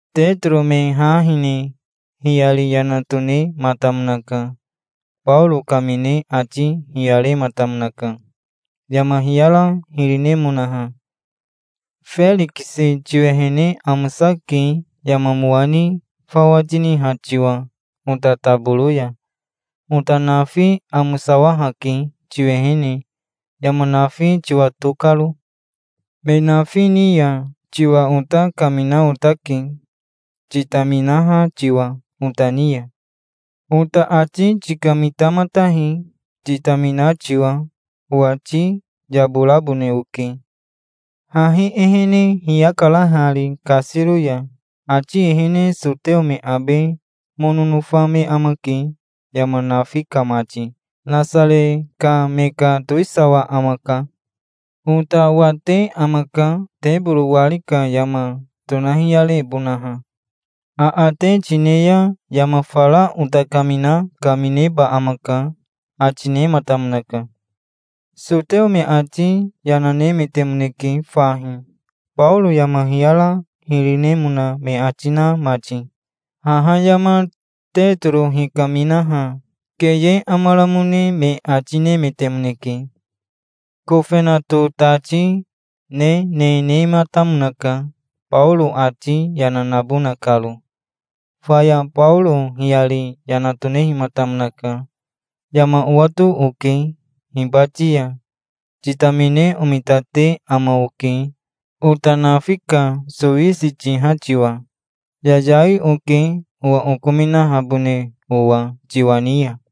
Tetoro me ha hine hiyari yana tonematamonaka. Baoro kamine ati hiyarematamonaka, yama hiyara hiri nemonaha. "Ferikisi tiwehene amosake, yama mowa ni fawa tiniha tiwa ota taboro ya. Ota nafi amosawahake tiwehene, yama nafi tiwato karo. Me nafi ni ya tiwa ota kamina otake, titaminaha tiwa ota ni ya. Ota ati tikamitamatahi, titamina tiwa. Owati yaborabone oke. Hahi ehene hiyakara hari kasiro ya. Ati ehene soteo me abe mono nofa me amake yama nafi ka mati. Nasare ka me ka towisawa amaka. Ota wate amaka, teboro wari ka yama tonahiyarebonaha. Aate tine ya yama fara ota kamina kamineba amaka", ati nematamonaka. Soteo me ati yana, nemetemoneke fahi, Baoro yama hiyara hiri nemona me ati, na mati. Haha yama Tetoro hikaminaha keye amaramone me ati nemetemoneke. Kofenato tati nene nematamonaka, Baoro ati yana nabona karo. Faya Baoro hiyari yana tonehimatamonaka. "Yama owato oke. Hibati ya titamine omitate ama oke, ota nafi ka sowisi tiha tiwa. Yayai oke, owa okominahabone owa tiwa ni ya.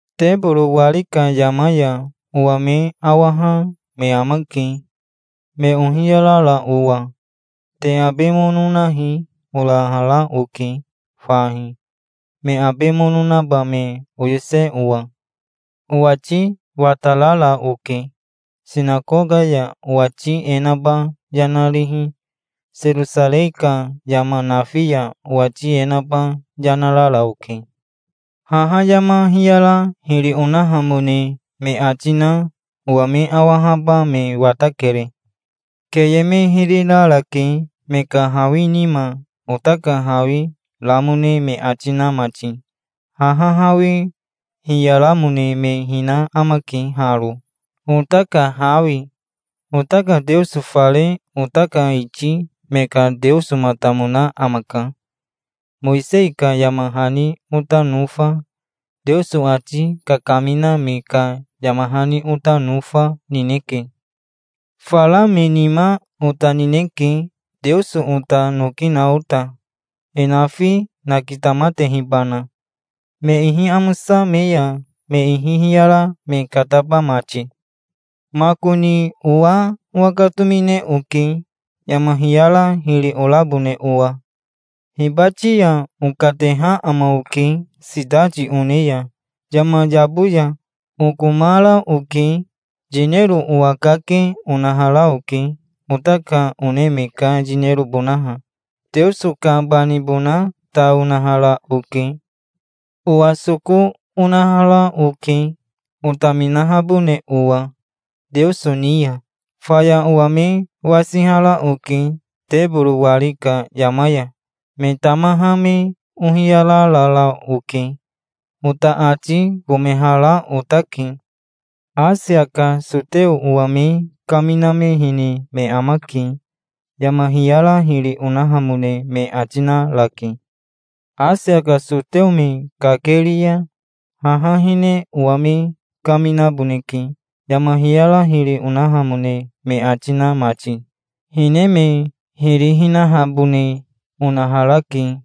Teboro wari ka yama ya owa me awaha me amake, me ohiyarara owa. 'Te abe mono nahi', orahara oke fahi, me abe mono naba me oyose owa. Owati watarara oke. Sinakoka ya owati e naba yana rihi, Serosarei ka yama nafi ya owati e naba yana rara oke. Haha yama hiyara hiri onahamone me ati na owa me awahaba me watakere. Keye me hiri rarake, me ka hawi nima ota ka hawi ramone me ati na mati. Haha hawi hiyaramone me hina amake haro, ota ka hawi. Ota ka Teoso fare ota ka iti me ka Teosomatamona amaka. Mowisei ka yama hani ota nofa, Teoso ati kakamina me ka yama hani ota nofa, nineke. Fara me nima ota nineke, Teoso ota noki na ota, e nafi nakitamatehibana, me ihi amosa me ya me ihi hiyara me kataba mati. Makoni owa owakatomine oke, yama hiyara hiri orabone owa". "Hibati ya okateha ama oke sitati one ya yama yabo ya. Okomara oke. Yinero owakake onahara oke, ota ka one me ka yinerobonaha. Teoso ka banibona ta, onahara oke. Owa soko onahara oke, otaminahabone owa Teoso ni ya. Faya owa me wasihara oke teboro wari ka yama ya. Me tamaha me ohiyararara oke. Ota ati komehara otake. Asia ka soteo owa me kaminamehene me amake. Yama hiyara hiri onahamone me ati narake. Asia ka soteo me kakeri ya, haha hine owa me kaminaboneke, yama hiyara hiri onahamone me ati na mati. Hine me hiri hinahabone onaharake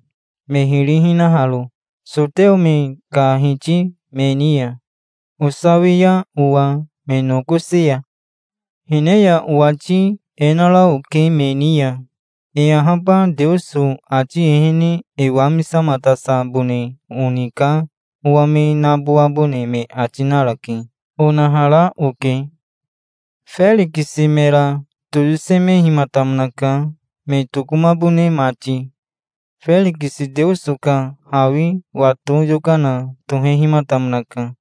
me hiri hinaharo, soteo me ka hiti me ni ya, osawia owa me nokosi ya. Hine ya owati e nara oke me ni ya. 'E ahaba Teoso ati ehene e wamisamatasabone oni ka owa me nabowabone me ati narake', onahara oke". Ferikisi mera toyosemehimatamonaka, me tokomabone mati. Ferikisi Teoso ka hawi wato yokana tohehimatamonaka.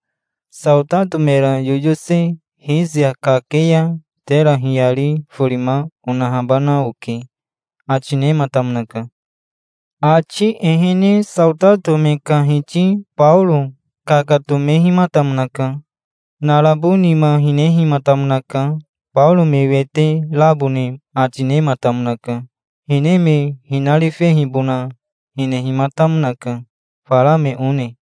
"Saotato mera yoyose Risia kake ya tera hiyari forima onahabana oke", ati nematamonaka. Ati ehene saotato me ka hiti Baoro kakatomehimatamonaka. Narabo nima hinehimatamonaka. Baoro me wete rabone ati nematamonaka. Hine me hinarifehibona hinehimatamonaka, fara me one.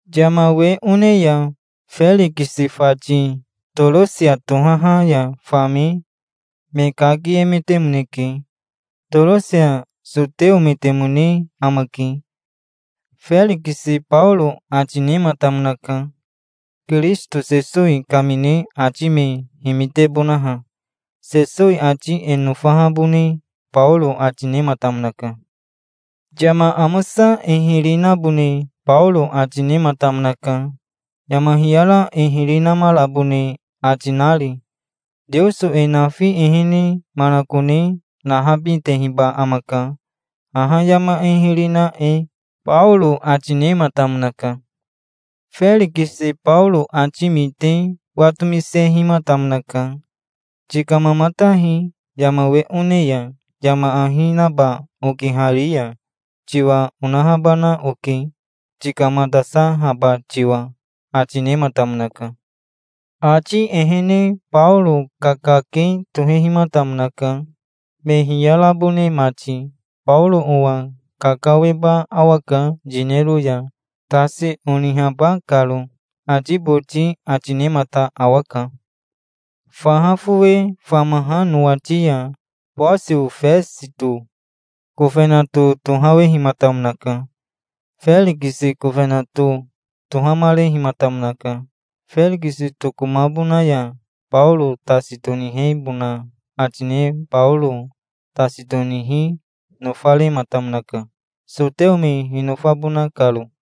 Yama we one ya Ferikisi fati Torosia tohaha ya fame me kakiemetemoneke. Torosia soteometemone amake. Ferikisi Baoro ati nematamonaka, Kirisito Sesowi kamine ati me himitebonaha. Sesowi ati e nofahabone Baoro ati nematamonaka. Yama amosa e hiri nabone Baoro ati nematamonaka, yama hiyara e hiri namarabone ati nari. "Teoso e nafi ehene manakone nahabitehiba amaka, haha yama e hiri na e", Baoro ati nematamonaka. Ferikisi Baoro ati mite watomisehimatamonaka. "Tikamamatahi. Yama we one ya yama ahi naba okihari ya tiwa onahabana oke, tikamatasahaba tiwa", ati nematamonaka. Ati ehene Baoro kakake tohehimatamonaka, me hiyarabone mati. "Baoro owa kakaweba awaka yinero ya, tasi onihaba karo", ati boti ati nemata awaka. Faha fowe famaha nowati ya Bosio Fesito kofenato tohawehimatamonaka. Ferikisi kofenato tohamarehimatamonaka. Ferikisi tokomabona ya Baoro tasi tonihebona ati ne Baoro tasi tonihi nofamarematamonaka, soteo me hinofabona karo.